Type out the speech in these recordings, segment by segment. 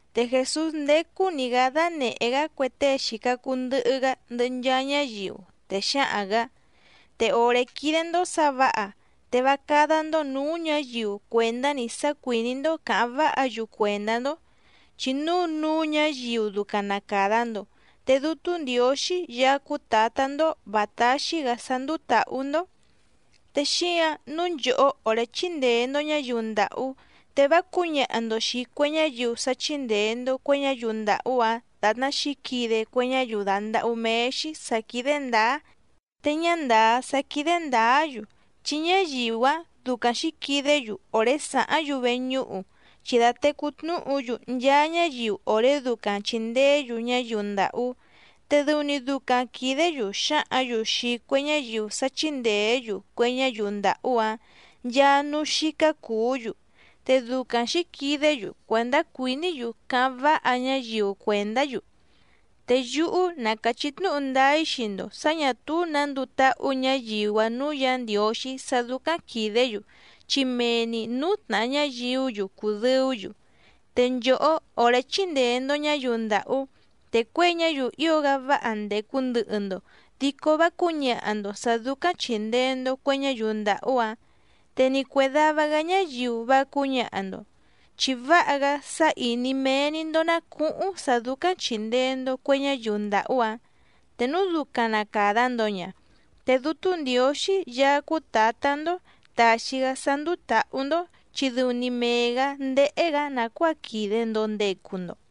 Te Jèsús ndécú‑ní‑gǎ dánèhé‑gá cue tée xìca cuu ndɨhɨ‑gá ndɨhɨ nchaa ñáyiu, te xǎhaⁿ‑gǎ: —Te òré quídé‑ndó sǎ vǎha te vá cádá‑ndó nǔú ñǎyiu cuèndá‑ni sá cuìní‑ndó cǎháⁿ váha‑yu cuèndá‑ndó, chi núu núú ñǎyiu ducaⁿ na càda‑ndo te Dútú Ndiǒxí Yaá cúú Tǎtá‑ndó vǎ táxí‑gǎ sá ndúú tǎhú‑ndó. Te xíǎⁿ nǔu nchòhó òré chíndèe‑ndo ñáyiu ndàhú, te vá cǔñaha‑ndo xìi cue ñáyiu sá chíndèe‑ndo cue ñáyiu ndàhú‑áⁿ dàtná xǐquide cue ñáyiu dàndahú méé‑xí sǎ quídé ndǎá te ñá ndàá sá quídé ndǎá‑yu, chi ñáyiu‑áⁿ ducaⁿ xǐquidé‑yu òré sàháⁿ‑yu veñúhu, chi dàtecú tnúhu‑yu nchaa ñáyiu òré ducaⁿ chìndeé‑yu ñáyiu ndàhú. Te dɨu‑ni ducaⁿ quìdé‑yu xǎhǎⁿ‑yu xii cue ñáyiu sá chíndèé‑yu cue ñáyiu ndàhú‑áⁿ nchaa núú xícá cùú‑yu, te ducaⁿ xǐquidé‑yu cuèndá cuìní‑yu cáháⁿ váha ñáyiu cuèndá‑yu. Te yúhú na càchí tnúhu ndáá‑í xii‑ndo sǎ ñà túú nǎ nduu táhú ñǎyiu‑áⁿ nǔú Yǎ Ndiǒxí sá dúcáⁿ quìdé‑yu chi mee‑ni nǔú tnàha ñáyiú‑yu cùdɨú‑yu. Te nchòhó òré chíndèe‑ndo ñáyiu ndàhú, te cuěi ñáyiu ío‑gá váha ndècu ndɨhɨ‑ndo dico vá cǔñaha‑ndo sǎ dúcáⁿ chìndee‑ndo cue ñáyiu ndàhú‑áⁿ, te ni cuè dava‑gá ñáyiu vá cǔñaha‑ndo. Chi váha‑gá sá ìní méé‑ní‑ndó ná cùhuⁿ sá dúcáⁿ chìndee‑ndo cue ñáyiu ndàhú‑áⁿ. Te núu ducaⁿ na càda‑ndo ña, te Dútú Ndiǒxí Yaá cúú Tǎtá‑ndó tàxi‑gá sá ndúú tǎhú‑ndó chi dɨu‑ni mee‑gǎ ndéhé‑gǎ nàcuáa quìde‑ndo ndecu‑ndo.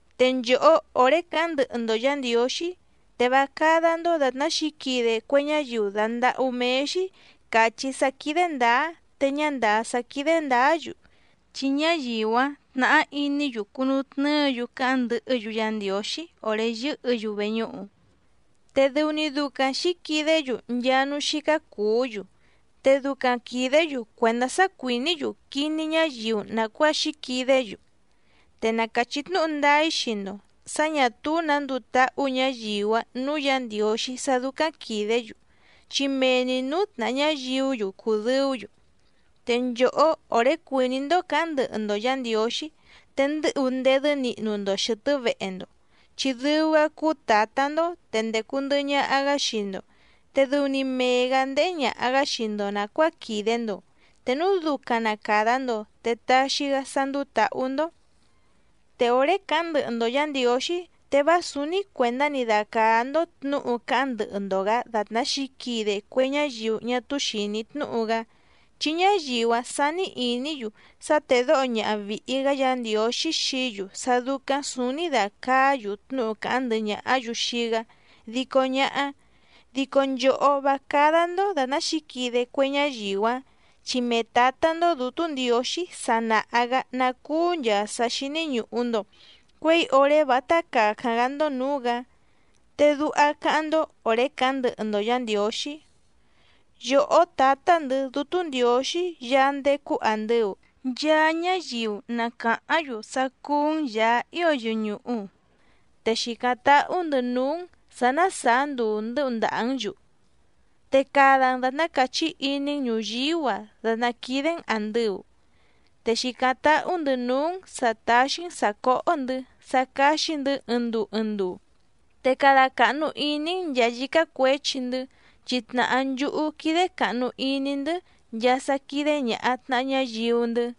’Te nchòhó òré càháⁿ ndɨhɨ‑ndo Yǎ Ndiǒxí, te vá cádá‑ndó dàtná xǐquide cue ñáyiu dàndahú méé‑xí càchí sá quídé ndǎá te ñá ndàá sá quídé ndǎá‑yu, chi ñáyiu‑áⁿ tnàhá iní‑yu cunutnɨ́ɨ‑yu càháⁿ ndɨhɨ́‑yu Yá Ndiǒxí òré yɨ́hɨ̌‑yu veñúhu. Te dɨu‑ni ducaⁿ xǐquidé‑yu nchaa núú xícá cùú‑yu, te ducaⁿ quìdé‑yu cuèndá sá cuìní‑yu quiní ñáyiu nàcuáa xǐquidé‑yu. Te na càchí tnúhu ndáá‑í xii‑ndo sǎ ñà túú nǎ nduu táhú ñǎyiu‑áⁿ nǔú Yǎ Ndiǒxí sá dúcáⁿ quìdé‑yu chi mee‑ni nǔú tnàha ñáyiú‑yu cùdɨú‑yu. Te nchòhó òré cuìní‑ndó cǎháⁿ ndɨhɨ‑ndo Yǎ Ndiǒxí, te ndɨ́hu ndedɨ́ nihnu‑ndo xɨ̀tɨ́ vehe‑ndo, chi dɨu‑gá cúú Tǎtá‑ndó te ndècu ndɨhɨ ñaha‑gá xii‑ndo, te dɨu‑ni mee‑gǎ ndéhé ñàha‑gá xii‑ndo nàcuáa quìde‑ndo, te núu ducaⁿ na càda‑ndo te taxi‑gá sá ndúú tǎhú‑ndó. ’Te òré càháⁿ ndɨhɨ‑ndo Yǎ Ndiǒxí te vá sǔúní cuèndá‑ni dacàá‑ndó tnǔhu cáháⁿ ndɨhɨ‑ndo‑gǎ dàtná xǐquide cue ñáyiu ñá túú xìní tnúhu‑gá, chi ñáyiu‑áⁿ sání ìní‑yu sá tédǒho ñaha vìhi‑gá Yǎ Ndiǒxí xií‑yu sá dúcáⁿ sǔúní dàcaá‑yu tnúhu càháⁿ ndɨhɨ ñàhá‑yu xii‑gá dico ñáhá. Dico nchòhó, vá cádá‑ndó dàtná xǐquide cue ñáyiu‑áⁿ, chi mee Tǎtá‑ndó Dǔtú Ndiǒxí sa nàha‑gá ná cúú nchàa sá xíní ñùhu‑ndo cuéi òré vátá càcáⁿ‑gá‑ndó nǔú‑gǎ. Te duha cáháⁿ‑ndó òré càháⁿ ndɨhɨ‑ndo Yǎ Ndiǒxí: Yòhó Tǎtá‑ndɨ̌ Dútú Ndiǒxí Yaá ndécú àndɨu, nchaa ñáyiu na càháⁿ‑yu sá cúú‑n Yàá ío yɨñùhu. Te xìcáⁿ táhú‑ndɨ̌ núú‑n sǎ ná sàá nduu ndɨ́hu ndàhá‑n‑yu. Te cada‑n dàtná càchí iní‑n ñùyíú‑a dàtná quídé‑n àndɨu. Te xìcáⁿ táhú‑ndɨ̌ núú‑n sǎ táxí‑n sǎ cóhó‑ndɨ̌ sá cáxí‑ndɨ̌ ɨɨⁿ nduu ɨɨⁿ nduu. Te cada càhnu iní‑n nchàa yícá cuěchi‑ndɨ́, chi tnàhá nchúhú quídé càhnu iní‑ndɨ́ nchaa sá quídé ñàha tnaha ñáyiu‑ndɨ́.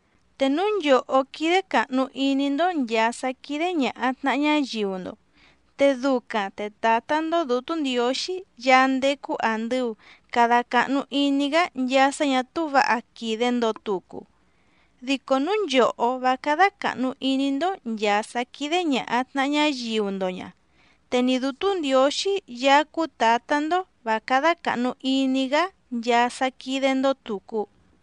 ’Te núu nchòhó quídé càhnu iní‑ndó nchàa sá quídé ñàha tnaha ñáyiu‑ndo, te ducaⁿ te Tǎtá‑ndó Dǔtú Ndiǒxí Yaá ndécú àndɨu cada cahnu iní‑gá nchaa sá ñà túú vǎha quìde‑ndo tucu. Dico núu nchòhó vá cádá càhnu iní‑ndó nchàa sá quídé ñàha tnaha ñáyiu‑ndo ña, te ni Dǔtú Ndiǒxí Yaá cúú Tǎtá‑ndó vǎ cádá càhnu iní‑gá nchaa sá quídé‑ndó tùcu.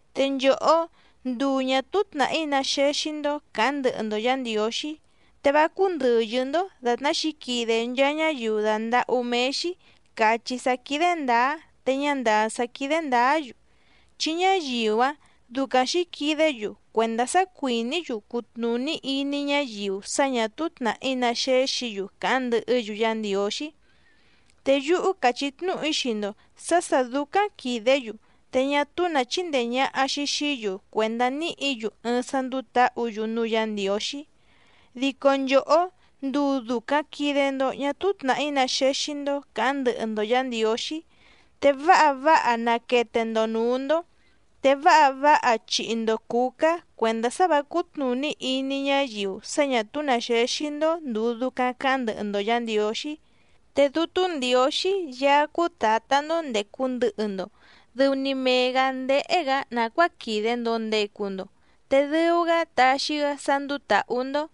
’Te nchòhó, nduu ñà túú tnàhí ná xéxí‑ndó càháⁿ ndɨhɨ‑ndo Yǎ Ndiǒxí, te vá cúndɨ̀yɨ́‑ndó dàtná xǐquide nchaa ñáyiu dàndahú méé‑xí càchí sá quídé ndǎá te ñá ndàá sá quídé ndǎá‑yu, chi ñáyiu‑áⁿ ducaⁿ xǐquidé‑yu cuèndá sá cuìní‑yu cutnùní iní ñáyiu sá ñà túú tnàhí ná xéxǐ‑yu càháⁿ ndɨhɨ́‑yu Yá Ndiǒxí. Te yúhú càchí tnúhu‑í xii‑ndo sǎ sà dúcáⁿ quìdé‑yu te ñá túú nǎ chindee ñàha‑xi xií‑yu cuèndá níhǐ‑yu ɨɨⁿ sá ndúú tǎhǔ‑yu núú Yǎ Ndiǒxí. Dico nchòhó, nduu dùcaⁿ quide‑ndo ñá túú tnàhí ná xéxí‑ndó càháⁿ ndɨhɨ‑ndo Yǎ Ndiǒxí, te váha váha naquete‑ndo nǔú‑ndó, te váha váha chihi‑ndo cǔcá cuèndá sá vǎ cútnùní iní ñáyiu sá ñà túú nǎ xéxí‑ndó ndùu ducaⁿ caháⁿ ndɨhɨ‑ndo Yǎ Ndiǒxí. Te Dútú Ndiǒxí Yaá cúú Tǎtá‑ndó ndècu ndɨhɨ‑ndo dɨu‑ni mee‑gǎ ndéhé‑gǎ nàcuáa quìde‑ndo ndecu‑ndo, te dɨu‑gá taxi‑gá sá ndúú tǎhú‑ndó.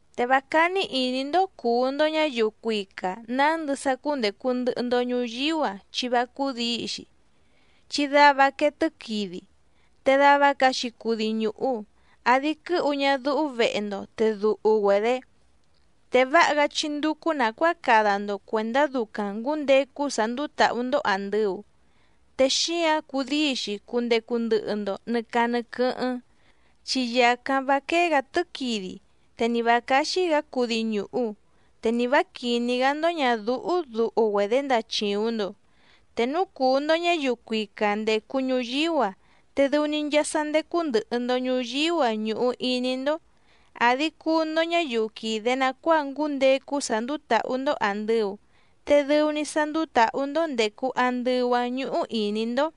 ’Te vá cání ìní‑ndó cùu‑ndo ñáyiu cuica nǎndɨ sá cúndècu ndɨhɨ‑ndo ñuyíú‑a chi vá cúdǐi‑xi, chi dava quee tɨ́quidi, te dava caxi cudi ñùhu, àdi quɨ́hu ñadúhú vehe‑ndo te duhu‑güedě. Te váha‑gá chí ndúcú nàcuáa cada‑ndo cuèndá ducaⁿ ngǔndecu sá ndúú tǎhú‑ndó àndɨu, te xíǎⁿ cudíi‑xi cundecu ndɨhɨ‑ndo nɨ̀ caa nɨ quɨ́hɨ́ⁿ, chi yàcáⁿ vá quéé‑gǎ tɨ́quidi, te ni vǎ cáxí‑gǎ cudi ñùhu, te ni vǎ quìní‑gá‑ndó ñàdúhú duhu‑güedě ndachìuⁿ‑ndo. Te núu cùu‑ndo ñáyiu cuica ndècu ñuyíú‑a, te dɨu‑ni nchaa sá ndécú ndɨ̀hɨ‑ndo ñuyíú‑a ñùhu iní‑ndó. Àdi cuu‑ndo ñáyiu quìde nacuáa ngúndecu sá ndúú tǎhú‑ndó àndɨu, te dɨu‑ni sá ndúú tǎhú‑ndó ndècu andɨu‑áⁿ ñúhú ìní‑ndó.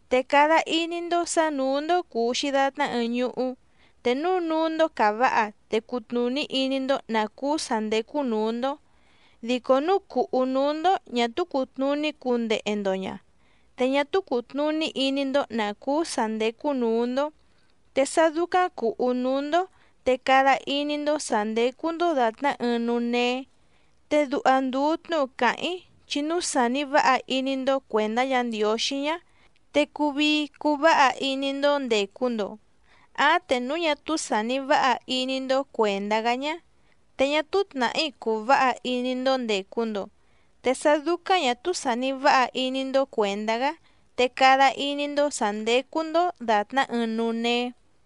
’Te cada iní‑ndó sǎ nǔú‑ndó cùu‑xi datná ɨɨⁿ ñuhú. Te núu núú‑ndó càváha te cùtnuní iní‑ndó nǎ cúú sǎ ndécú nǔú‑ndó. Dico núu cùhú núú‑ndó ñà túú cùtnuní cundehe‑ndo ña, te ñá túú cùtnuní iní‑ndó nǎ cúú sǎ ndécú nǔú‑ndó. Te sá dúcáⁿ cùhú núú‑ndó te cada iní‑ndó sǎ ndécú‑ndó dàtná ɨɨⁿ núú néé. Te duha ndùu tnúhu càháⁿ‑í chi núu sàni váha iní‑ndó cuèndá Yǎ Ndiǒxí ñá, te cùu vii cuu váha iní‑ndó ndècu‑ndo. Áⁿ te núu ñá túú sàni váha iní‑ndó cuèndá‑gá ñá, te ñá túú tnàhí cùu váha iní‑ndó ndècu‑ndo. Te sá dúcáⁿ ñà túú sàni váha iní‑ndó cuèndá‑gá te cada iní‑ndó sǎ ndécú‑ndó dàtná ɨɨⁿ núú néé.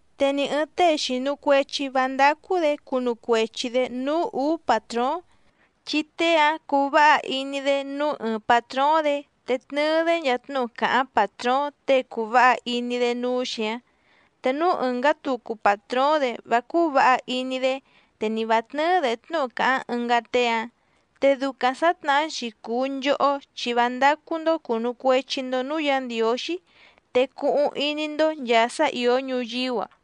’Te ni ɨ̀ɨⁿ tée xìnu cuechi vá ndácú‑dě cunu cuechi‑dě núú ùú pàtróóⁿ, chi tée‑áⁿ cuu váha iní‑dé núú ɨɨⁿ pàtróóⁿ‑dě te tnɨɨ‑dé nchaa tnúhu càháⁿ pàtróóⁿ tée cùu váha iní‑dé núú‑xi‑áⁿ. Te núú ɨ̀ngá tucu pàtróóⁿ‑dě vá cúú vǎha iní‑dé, te ni vǎ tnɨ́ɨ́‑dě tnúhu càháⁿ ɨngá tée‑áⁿ. Te ducaⁿ sǎtnahá‑xi cùu nchohó chi vá ndácú‑ndó cùnu cuechi‑ndo núú Yǎ Ndiǒxí te cuhuⁿ iní‑ndó nchàa sá ìó ñuyíú‑a.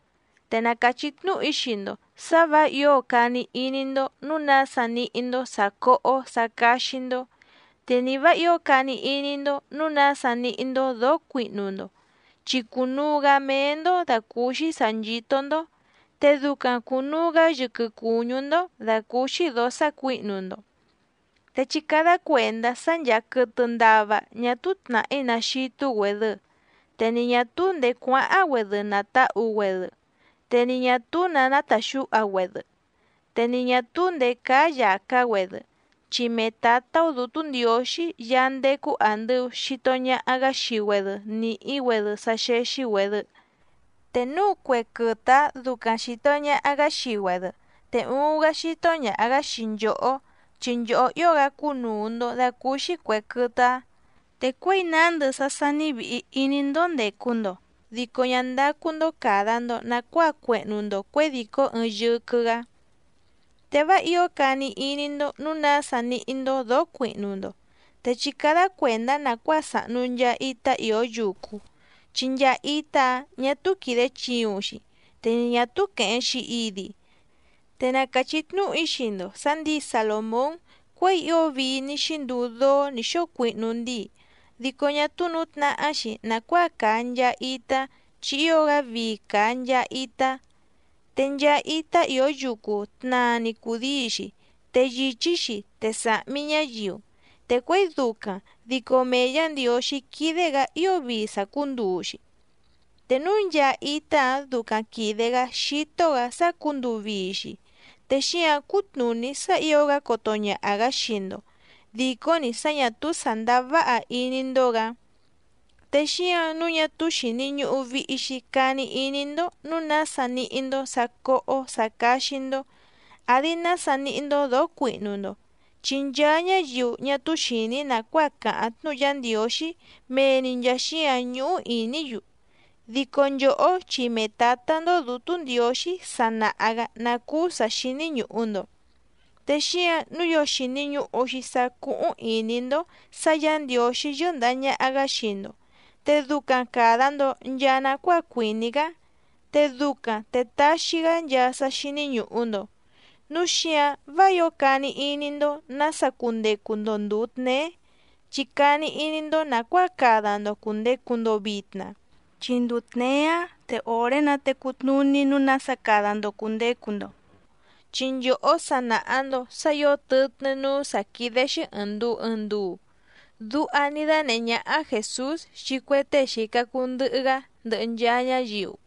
’Te na càchí tnúhu‑í xii‑ndo sǎ vǎ ǐo cani iní‑ndó nǔu nása níhí‑ndó sǎ cóhó sǎ cáxí‑ndó, te ni vǎ ǐo cani iní‑ndó nǔu nása níhí‑ndó dǒó cuihnu‑ndo, chi cùnuu‑gá méé‑ndó dàcúúxí sǎ nchító‑ndó, te ducaⁿ cùnuu‑gá yɨquɨ cùñú‑ndó dàcúúxí dǒó sácuǐhnu‑ndo. Te chí cádá cuèndá sá ncháá quɨ̀tɨ ndava ñá túú tnàhí ná xítú‑güèdɨ, te ni ñà túú ndèé cuáháⁿ‑güedɨ nàtahu‑güedɨ, te ni ñà túú nǎ nátàxúha‑güedɨ, te ni ñà túú ndèé cáá yàcá‑güedɨ, chi mee Tǎtá‑ó Dǔtú Ndiǒxí Yaá ndécú àndɨu xito ñaha‑gá xii‑güedɨ nìhí‑güedɨ sá xéxí‑güèdɨ. Te núu cue quɨtɨ‑áⁿ ducaⁿ xìto ñaha‑gá xii‑güedɨ, ¡te uuⁿ‑gá xító ñàha‑gá xii nchòhó, chi nchòhó ío‑gá cúnùu‑ndo dacúúxí cuè quɨtɨ‑áⁿ! Te cuěi nándɨ sá sání vìhi iní‑ndó ndècu‑ndo, dico ñá ndácú‑ndó càda‑ndo nacuáa cuehnu‑ndo cuědìcó ɨɨⁿ yɨquɨ‑gǎ. ’Te vá ǐo cani iní‑ndó nǔu nása níhí‑ndó dǒó cuihnu‑ndo. Te chí cádá cuèndá nàcuáa sàhnu nchaa itá ìó yucu, chi nchaa itá‑áⁿ ñà túú quìde chiuⁿ‑xi, te ni ñà túú quèheⁿ‑xi idi. Te na càchí tnúhu‑í xii‑ndo sǎ ndǐi Salòmón cuěi ío vii ní xínduu dóó nǐ xóo cuihnu ndíi, dico ñá túú nǔtnahá‑xi nàcuáa càa nchaa itá, chi ío‑gá vii càa nchaa itá. Te nchaa itá ìó yucu tnaa‑ni cùdíi‑xi, te yìchí‑xi te sàhmi ñáyiu. Te cuěi ducaⁿ dico mee Yǎ Ndiǒxí quídé‑gǎ ío vii sàcúnduu‑xi. Te núu nchaa itá‑áⁿ ducaⁿ quìde‑gá xító‑gǎ sácǔnduu vii‑xi, te xíǎⁿ cútnùní sá ǐo‑gá coto ñaha‑gǎ xii‑ndo, dìcó‑ni sá ñà túú sàndáá váha iní‑ndó‑gǎ. Te xíǎⁿ nǔu ñá túú xìni ñuhu vihi‑xi cani iní‑ndó nǔu nása níhí‑ndó sǎ cóhó sǎ cáxí‑ndó, àdi nása níhí‑ndó dǒó cuihnu‑ndo. Chi nchaa ñáyiu ñá túú xìní nàcuáa càháⁿ tnúhu Yá Ndiǒxí mee‑ni nchàa xíǎⁿ ñúhú ìní‑yu. Dico nchòhó chi mee Tǎtá‑ndó Dǔtú Ndiǒxí sa nàha‑gá ná cúú sǎ xíní ñùhu‑ndo. Te xíǎⁿ nǔu ío xìni ñuhu‑xi sá cúhúⁿ ìní‑ndó sǎ Yǎ Ndiǒxí yɨ́ndàha ñaha‑gá xii‑ndo, te ducaⁿ càda‑ndo nchaa nacuáa cuìní‑gá, te ducaⁿ te taxi‑gá nchaa sá xíní ñùhu‑ndo. Núu xíǎⁿ vá ǐo cani iní‑ndó nǎsa cundecu‑ndo ndùu tneé, chi cani iní‑ndó nàcuáa cada‑ndo cùndecu‑ndo vitna, chi nduu tněé‑áⁿ te òré‑nǎ te cutnùní nǔu nása cada‑ndo cùndecu‑ndo. Chi nchòhó sa nàha‑ndo sá ǐo tɨtnɨ́ núú sǎ quídé‑xí ɨ̀ɨⁿ nduu ɨɨⁿ nduu —duha ní dánèhé ñáhá Jèsús xii cue tée xìca cuu ndɨhɨ‑gá ndɨhɨ nchaa ñáyiu.